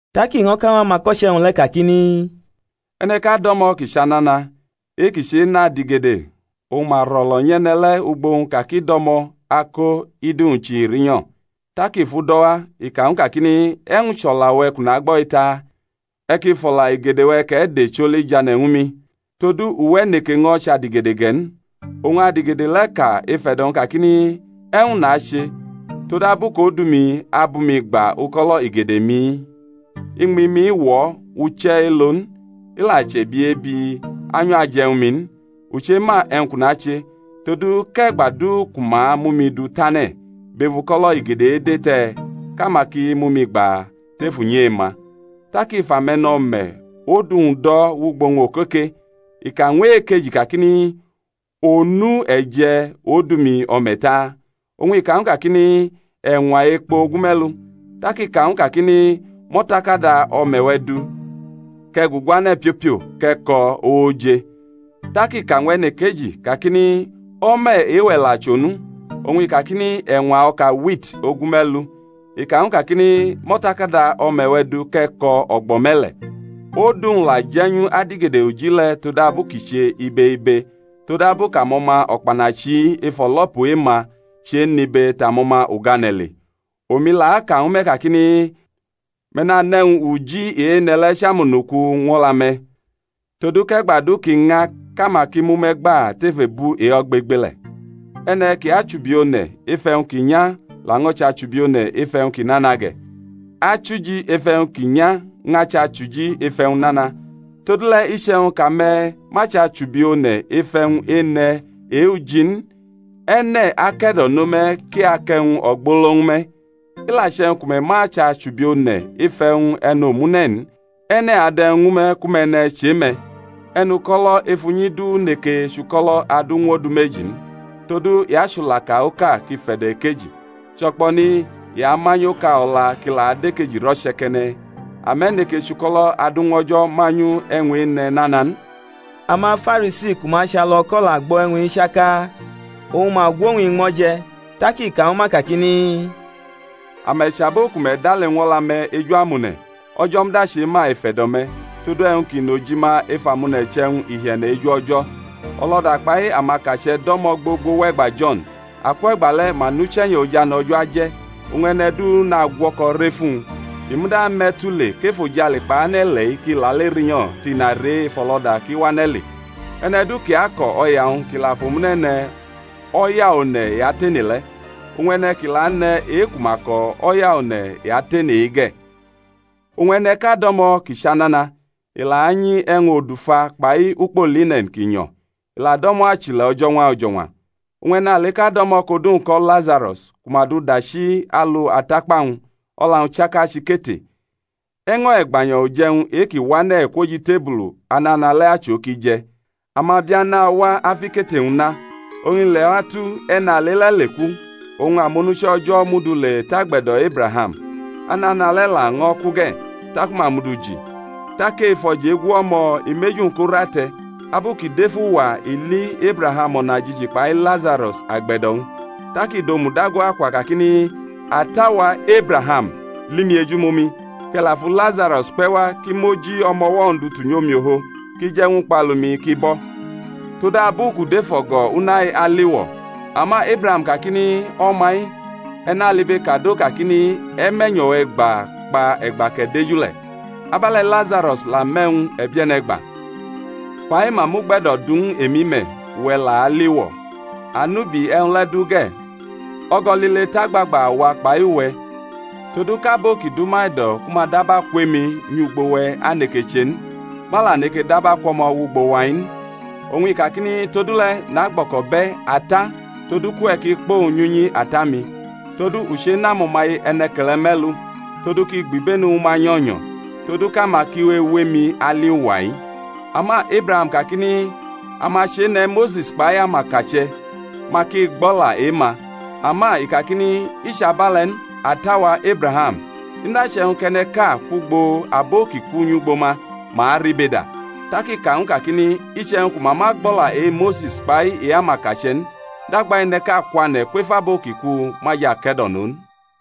Tak i ño̩ ka ñw amako̩che̩-wñ le̩ kakini, E̩ne̩ʼka do̩mo̩ kʼi chʼanana, e-kʼi chenʼadigede; oñ ma ro̩lo̩ nyʼe̩ne̩ le̩ ugbʼowñ ka kʼi do̩mo̩ ako idu-wñ chihi rinyo̩. Tak i fʼu do̩ wa, i ka ñw u kakini, E̩wñ chʼo̩la-we̩ kʼu nagbo̩-i taa? E̩ ki fʼo̩la igede-we̩ kʼe̩ de choli jane̩ ñwu mi; todu uwe̩ neke ño̩ chʼadigede ge̩ n. Oñ adigede le̩ ka ef e̩do̩-wñ kakini, E̩wñ nache, todabu kʼodu-mi abʼumi gba uko̩lo̩ igede-mi? Iñmi-mi wo̩ uche̩ elo̩ n; i la chʼebiebi, anyo̩ aje̩ ñwu mi n. U chema e̩wñ kʼu nache, todu kʼe̩gba du ku ma mʼumi du tane̩ bʼef uko̩lo̩ igede-ede te̩ kʼama ki mʼumi gba tef unyi e-ma. Tak i fʼame̩no̩me̩ odu-wñ do̩ wʼugbʼowñ okoke. I ka ñw e-ejodudu kakini, Onu e̩ je̩ odu-mi o̩me̩ taa? Oñ i ka ñw u kakini, E̩ñwa ekpo ogume̩lu. Tak i ka ñw u kakini, Mʼo̩takada o̩me̩-we̩ du, kʼe̩ guguane̩ piopio kʼe̩ ko̩, ooje. Tak i ka ñw e̩nekeji, kakini, O̩me̩ e-we̩ la chʼonu? Oñ i kakini, E̩ñwa o̩ka wit ogume̩lu. I ka ñw u kakini, Mʼo̩takada o̩me̩-we̩ du kʼe̩ ko̩, o̩gbo̩ me̩le̩. Odu-wñ la je̩nyu adigede uji le̩ todabu kʼi che ibe ibe: todabu kʼamo̩ma o̩kpanachi-i ef o̩lo̩pu e-ma chenʼibe tʼamo̩ma ugane̩ le. Omi la aka ñwu me̩ kakini, Me̩ nanʼe̩wñ uji ene̩ le̩ chʼamonuku ñw o̩la-me̩; todu kʼe̩gba du kʼi ña kʼama ki mʼume̩ gba tef ebu e-ogbegbele̩. E̩ne̩ ki achubi one̩ ef e̩wñ ki nya laño̩ chʼachubi one̩ ef e̩wñ ki nana ge̩. Achuji ef e̩wñ ki nya ñʼachʼachuji ef e̩wñ nana. Todule̩ iche̩wñ kʼame̩ ma chʼamachubi one̩ ef e̩wñ-ene̩ e-uji n, e̩ne̩ ake̩do̩no me̩ kʼi akʼe̩wñ ogbolo ñwu me̩? I la che̩wñ ku me̩ ma chʼamachubi one̩ ef e̩wñ e̩nomune̩ n, e̩ne̩ adʼe̩wñ ñwu me̩ ku me̩ ne̩ chʼe̩-me̩? E̩nuko̩lo̩ ef unyi du neke chʼuko̩lo̩ adu ñw odu meji n; todu i achulaka oka kʼi fe̩do̩ ekeji, cho̩kpo̩ni i amanyʼoka o̩la kʼi la dʼekeji roche̩ke̩ne̩. Ame̩ neke chʼuko̩lo̩ adu ñw O̩jo̩ manyu e̩wñ-ene̩ nana n. AmaFarisi ku ma achʼalu o̩ko̩ la gbo̩ e̩wñ-i chaka; oñ ma gwʼowñ iñmo̩ je̩. Tak i ka ñwu ma kakini, Ame̩ chʼabo ku me̩ dale ñw o̩la-me̩ eju amone̩; O̩jo̩ muda chema ef e̩do̩-me̩; todu e̩wñ ki nʼojima ef amone̩ chʼe̩wñ ihie̩ne̩ eju O̩jo̩. O̩lo̩da kpai amakache̩ do̩mo̩ gbogbo wʼe̩gba Jo̩n: akwʼe̩gba le̩ ma nʼuche̩nyo̩ ojane̩ O̩jo̩ aje̩, oñ e̩ne̩ du nagwo̩ko̩ rʼef uwñ. I muda me̩ tule kʼefojale kpai ane̩-ile̩-i ki lale rinyo̩ tʼina re ef o̩lo̩da kʼi wane̩ le. E̩ne̩ du kʼi ako̩ o̩ya-wñ kʼi la fʼomune̩ ne̩, o̩ya one̩ i atene le̩; oñ e̩ne̩ kʼi la ane̩ e-ku ma ko̩, o̩ya one̩ i atene-i ge̩. Oñ e̩ne̩ʼka do̩mo̩ ki chʼanana; i la anyi e̩wñ odufa kpai ukpo line̩n ki nyo̩, i la do̩mo̩ achile̩ o̩jo̩ñwa o̩jo̩ñwa. Oñ e̩naleʼka do̩mo̩ kʼodu-wñ ko̩ Lazaro̩s ku ma du dachi alu atakpa-wñ, o̩la-wñ chaka chʼikete, e̩ño̩ e̩gbanyo̩ uje̩wñ e-ki wane̩ kwʼoj itebulu anana le̩ achʼo kʼi je̩; amabia nawa afʼikete-wñ na. Oñ i leatu, e̩nale le̩ leku, oñ amonuche̩ O̩jo̩ mʼu du le tʼagbe̩do̩ Ebraham. Anana le̩ laño̩ ku ge̩, taku ma mʼu du ji. Tak ef o̩jegu o̩mo̩, i mʼeju-wñ ko rʼate̩, abu kʼi dʼef uwa, oñ i li Ebraham o̩najiji kpai Lazaro̩s agbe̩do̩-wñ. Tak i dʼomu dago akwa kakini, Ata-wa, Ebraham, li mi ejumomi, kʼe̩ la fu Lazaro̩s kpe̩ wa kʼi mʼoji o̩mo̩wo̩-wñ du tunyʼomiofo kʼi je̩ ñw ukpalu-mi ki bo̩; todabu kʼu dʼef o̩go̩ una-i aliwo̩. Ama Ebraham kakini, O̩ma-i, e̩ nalibekado kakini, E̩ mʼe̩nyo̩-we̩ gba kpa e̩gba kʼe̩ deju le̩. Abe̩le̩ Lazaro̩s la mʼe̩wñ e̩bie̩ne̩ gba. Fa-i ma mʼugbe̩do̩ du ñw u emi me̩, uwe̩ la alʼiwo̩. Anubi e̩wñ le̩ du ge̩, o̩go̩ lile tʼagbagba awa kpai uwe̩, todu kʼabo ki dʼuma e̩do̩ ku ma daba kwʼemi nyʼugbo-we̩ aneke che n, ma la neke daba kwʼo̩mo̩ wʼugbo wa-i n. Oñ i kakini, Todule̩ nagbo̩ko̩bʼe̩, ata, todu kʼuwe̩ ki kpʼowñ nyʼunyi ata-mi, todu u chenʼamo̩maye e̩ne̩ke̩le̩ me̩lu, todu kʼi gbʼibenu ñwu ma nyo̩nyo̩, todu kʼama ki we ewʼemi ali uwa-i. Ama Ebraham kakini, Ama chene̩ Mose̩s kpai amakache̩, ma ki gbʼo̩la e-ma. Ama i kakini, I chʼabe̩le̩ n, ata-wa, Ebraham, i muda che̩wñ kʼe̩ne̩ʼka kwʼugbo abo ki ku nyʼugbo ma, ma aribeda. Tak i ka ñw u kakini, Iche̩wñ ku ma ma gbʼo̩la e-Mose̩s kpai e-amakache̩ n, dagba e̩ne̩ʼka kwane̩ kwef abo ki ku ma jʼake̩do̩no n.